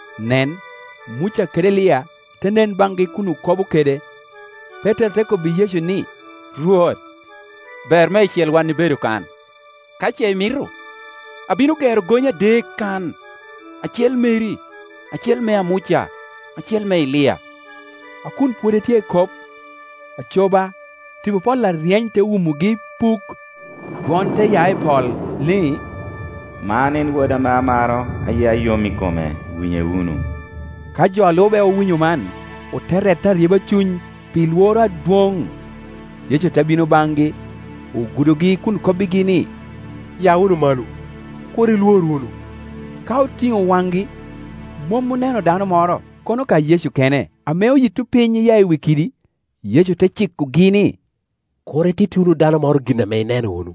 Nen, Muca kede Elia te nen baŋgi kun okobo kede. Petero te kobbi Yecu ni, “Rwot, ber meicel wan ibedo kan. Ka ce imito, abino gero gonye adek kan, acel meri, acel mea Muca, acel me Elia.” A kun pwod etye ekop, aco ba, tipo pol aryeny te wumogi ipuk, dwon te ya i pol, ni, “Man en Woda ame amaro; a yia yom i kome, winye wunu.” Ka jo a lube owinyo man, ote rette aryeba cuny pi lworo adwoŋ. Yecu te bino baŋgi, ogudogi kun kobbigi ni, “Ya wunu malo; kur ilwor wunu.” Ka otiŋo waŋgi, mom oneno dano moro, kono ka Yecu kene. Ame oyito piny iya i wi kidi, Yecu te cikogi ni, “Kur ititti wunu dano moro gin ame ineno wunu,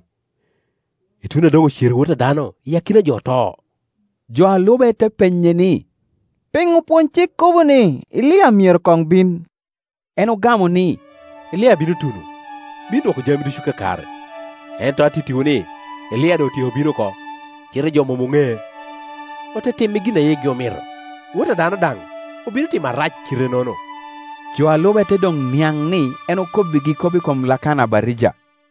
ituno a doŋ ocero Wot a dano iya i akina jo oto.” Jo a lube te penye ni, “Piŋo opwonycik kobo ni Elia myero koŋ bin?” En ogamo ni, “Elia bino tuno, bino dwoko jami ducu kakare. Ento an atittiwu ni, Elia doŋ otyeko bino oko, cite jo mom oŋee, ote time i gin a yigi omito. Wot a dano daŋ obino time arac kite-nono.” Jo a lube te doŋ niaŋ ni en okobbigi kop i kom Lakana Abatija.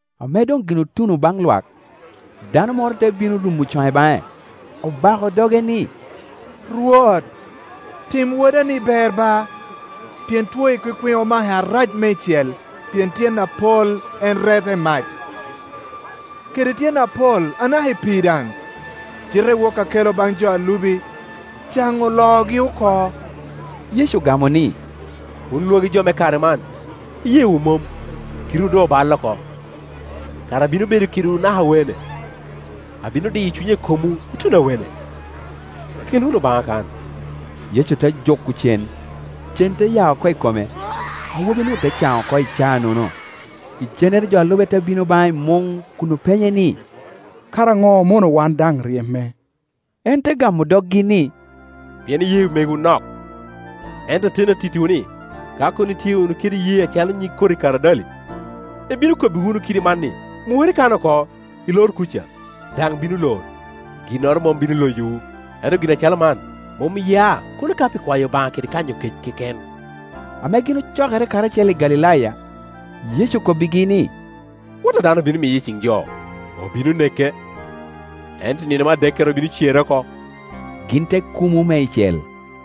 Ame doŋ gin otuno baŋ lwak, dano moro te bino rumo cone baŋe, obako doge ni, “Rwot, tim woda-ni ber ba, pien two ekwikwiŋ omake arac meicel; pien tyen apol en rette i mac, kede tyen apol anaka i pi i daŋ. Cite woki akele baŋ jo a lubi, caŋo oloogi oko.” Yecu ogamo ni, “Wun lwagi jo me kare man, iyeewu mom, kitewu doŋ oballe oko; kara abino bedo kedwu naka awene? Abino diyo cunya i komwu ituno awene? Kele wunu baŋa kan.” Yecu te juko cen, cen te ya oko i kome, awobi-nu te caŋ oko i caa-nono. Icennere jo a lube te bino baŋe i muŋ kun openye ni, “Kara ŋo omono wan daŋ ryeme?” Kor. 13.2En te gamo doggi ni, “Pien iyee mewu nok. Ento ateni atittiwu ni, ka kono itye wunu kede iyee acalo nyig koti karadali, ibino wunu kobbi kidi man ni, ‘Mukere i kan oko, ilor kuca’, daŋ bino lor; ginnoro mom bino loyowu. [ Ento gin acalo man mom ya, kono ka pi kwayo Obaŋa kede kanyo kec keken.]” Ame gin ocokere karacel i Galilaya, Yecu okobbigi ni, “Wot a dano obino miye i ciŋ jo, obino neke, ento i ninome adekkere obino cere oko,” Gin te kumo meicel.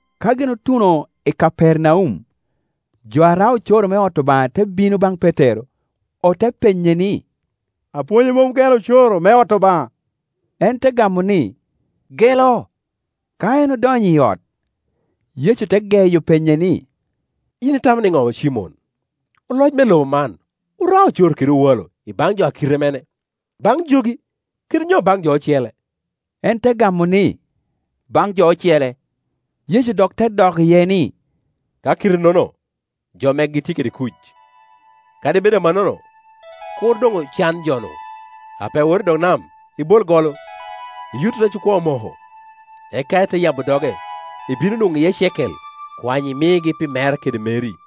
Ka gin otuno i Kapernaum, jo a rao ocoro me ot Obaŋa te bino baŋ Petero, ote penye ni, “Apwonywu mom gelo ocoro me ot Obaŋa?” En te gamo ni, “Gelo.” Ka en odonyo i ot, Yecu te geyo penye ni, “Yin itamo niŋo Cimon? Oloc me lobo man orao ocoro kede owalo i baŋ jo a kite mene? Baŋ jogi, kade nyo i baŋ jo ocele?” En te gamo ni, “Baŋ jo ocele.” Yecu dok te dok iye ni, “Ka kite-nono, jo megi tye kede kuc. Kadi bed amannono, kur doŋ ocan jo-nu. Apee wot i dog nam, ibol golo, iyut rec okwoŋo moko, eka ite yabo doge, ibino nwoŋo iye cekel. Kwany imigi pi mera kede meri.”